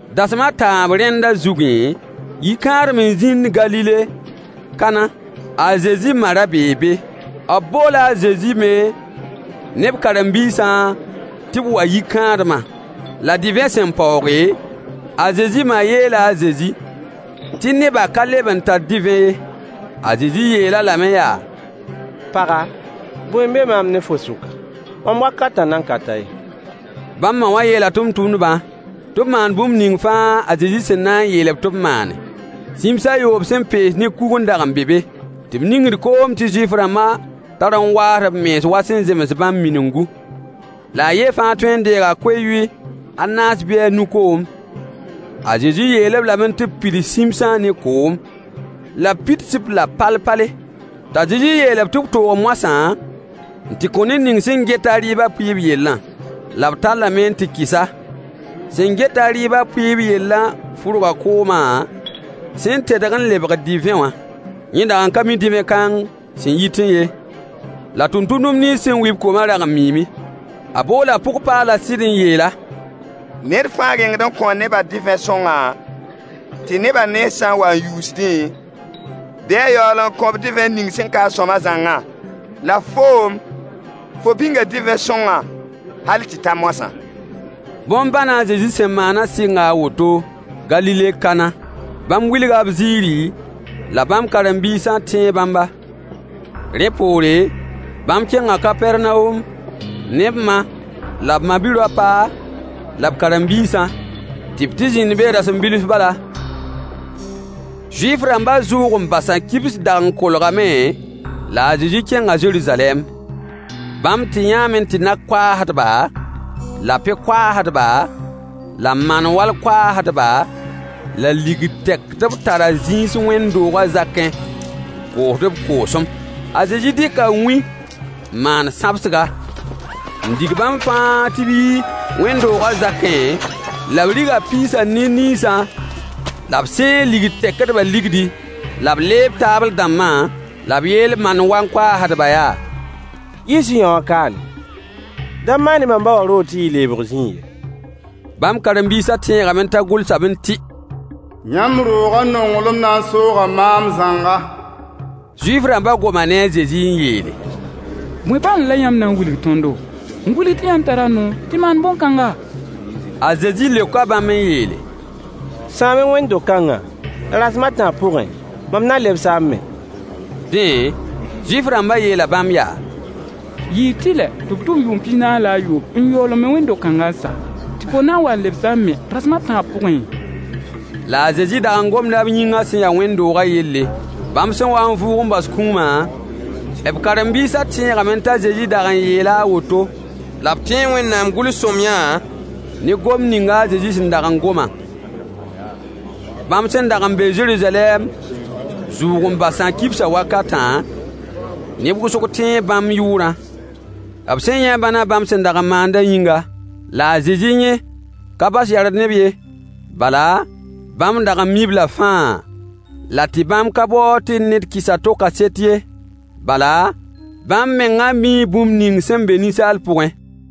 Dasem a tãab rẽnda zugẽ, yi-kãadem n zĩnd Galile Kana. A Zezi ma ra bee be. B boola a Zezi me ne b karen-biisã tɩ b wa yi-kãadmã. La divẽ sẽn paooge, a Zezi ma yeela a Zezi tɩ nebã ka leb n tar divẽ ye. A Zezi yeel-a lame yaa: Paga, bõe n be maam ne fo sʋka? Mam wakatã nan ka ta ye. Bãmb ma wã yeela tʋmtʋmdbã tɩ b maan bũmb ning fãa a Zezi sẽn na n yeel-b tɩ b maane. Sĩms a yoob sẽn pees ne kug n dag n be be, tɩ b ningd koom tɩ Zuif-rãmbã tar n waasd b mens wa sẽn zems bãmb miningu, la a yen fãa tõe deega ko-yʋy a naas bɩ a nu koom. A Zezi yeel-b lame tɩ b pids sĩmsã ne koom, la b pids-b la pal-pale. T'a Zezi yeel-b tɩ b toog moasã n tɩ kõ ned ning sẽn get-a rɩɩbã pʋɩɩb yellã. La b tallame n tɩ kɩs-a. Sẽn get-a rɩɩbã pʋɩɩb yellã fʋrga koomã sẽn tedg n lebg divẽ wã. Yẽ dag n ka mi divẽ kãng sẽn yitẽ ye, la tʋmtʋmdb nins sẽn wi-b koomã rag n miime. A boola pʋg-paalã sɩd n yeel-a: Ned fãa rengd n kõo nebã divẽ sõngã, tɩ nebã nens sã n wa n yuusdẽ, bɩ a yaool n kõ-b divẽ ning sẽn ka-a sõama zãngã. La foom, fo bĩnga divẽ sõngã hal tɩ ta moasã. Bõn-bãnã a Zezi sẽn maanã sɩnga a woto Galile Kana. Bãmb wilga b ziiri, la bãmb karen-biisã tẽe bãmba. Rẽ poore, bãmb kẽnga Kapɛrnawom ne b ma la b ma-bi-raopa, la b karen-biisã, tɩ b tɩ zĩnd be rasem bilf bala. Zuif-rãmbã zʋʋg-n-basã kibs dag n kolgame, la a Zezi kẽnga Zeruzalɛm. Bãmb tɩ yãame tɩ nag-koaasdba, la pe-koaasdba, la man-wall koaasdba, la ligd tɛkdb tara zĩis wẽnd-doogã zakẽ n koosd b koosem. A Zezi dɩka wĩ n maan sãbsga, n dig bãmb fãa tɩ b yi wẽnd-doogã zakẽ, la b riga piisã ne niisã, la b sãeeg ligd tɛkdbã ligdi, la b leeb taabl-dãmbã, la b yeel mol-wan koaasdbã yaa: Yiis-y yõwã kaane. Da maan-y mam ba wã roog tɩ yɩ leebg zĩig ye. Bãmb karen-biisã tẽegame t'a gʋlsame tɩ: Yãmb roogã nonglem na n sooga maam zãnga. Zuif-rãmbã goma ne a Zezi n yeele: Bõe bãnd la yãmb na n wilg tõndo, n wilg tɩ yãmb tara noor tɩ maan bõn-kãnga? A Zezi leoka bãmb n yeele: Sãam-y wẽnd-do-kãngã, la rasem a tãab pʋgẽ, mam na lebs-a n me. Dẽ, Zuif-rãmbã yeela bãmb yaa: Yɩɩ tɩlɛ tɩ b tʋm yʋʋm pis-naas la a yoob n yaool n me wẽnd-do-kãngã n sa, tɩ fo na n wa n lebs-a n me rasem a tãab pʋgẽ? La a Zezi dag n gomda b yĩngã sẽn ya wẽnd-doogã yelle. Bãmb sẽn wa n vʋʋg n bas kũumã, b karen-biisã tẽegame t'a Zezi dag n yeela a woto, la b tẽe Wẽnnaam gʋls-sõamyã ne gomd ning a Zezi sẽn dag n gomã. Bãmb sẽn dag n be Zeruzalɛm zʋʋg-n-basã kibsã wakatã, neb wʋsg tẽe bãmb yʋʋrã, b sẽn yã bãnã bãmb sẽn dag n maandã yĩnga, la a Zezi yẽ ka bas yard ne-b ye, bala, bãmb dag n mi-b-la fãa, la tɩ bãmb ka baood tɩ ned kɩs a to kaset ye, bala, bãmb mengã mii bũmb ning sẽn be ninsaal pʋgẽ.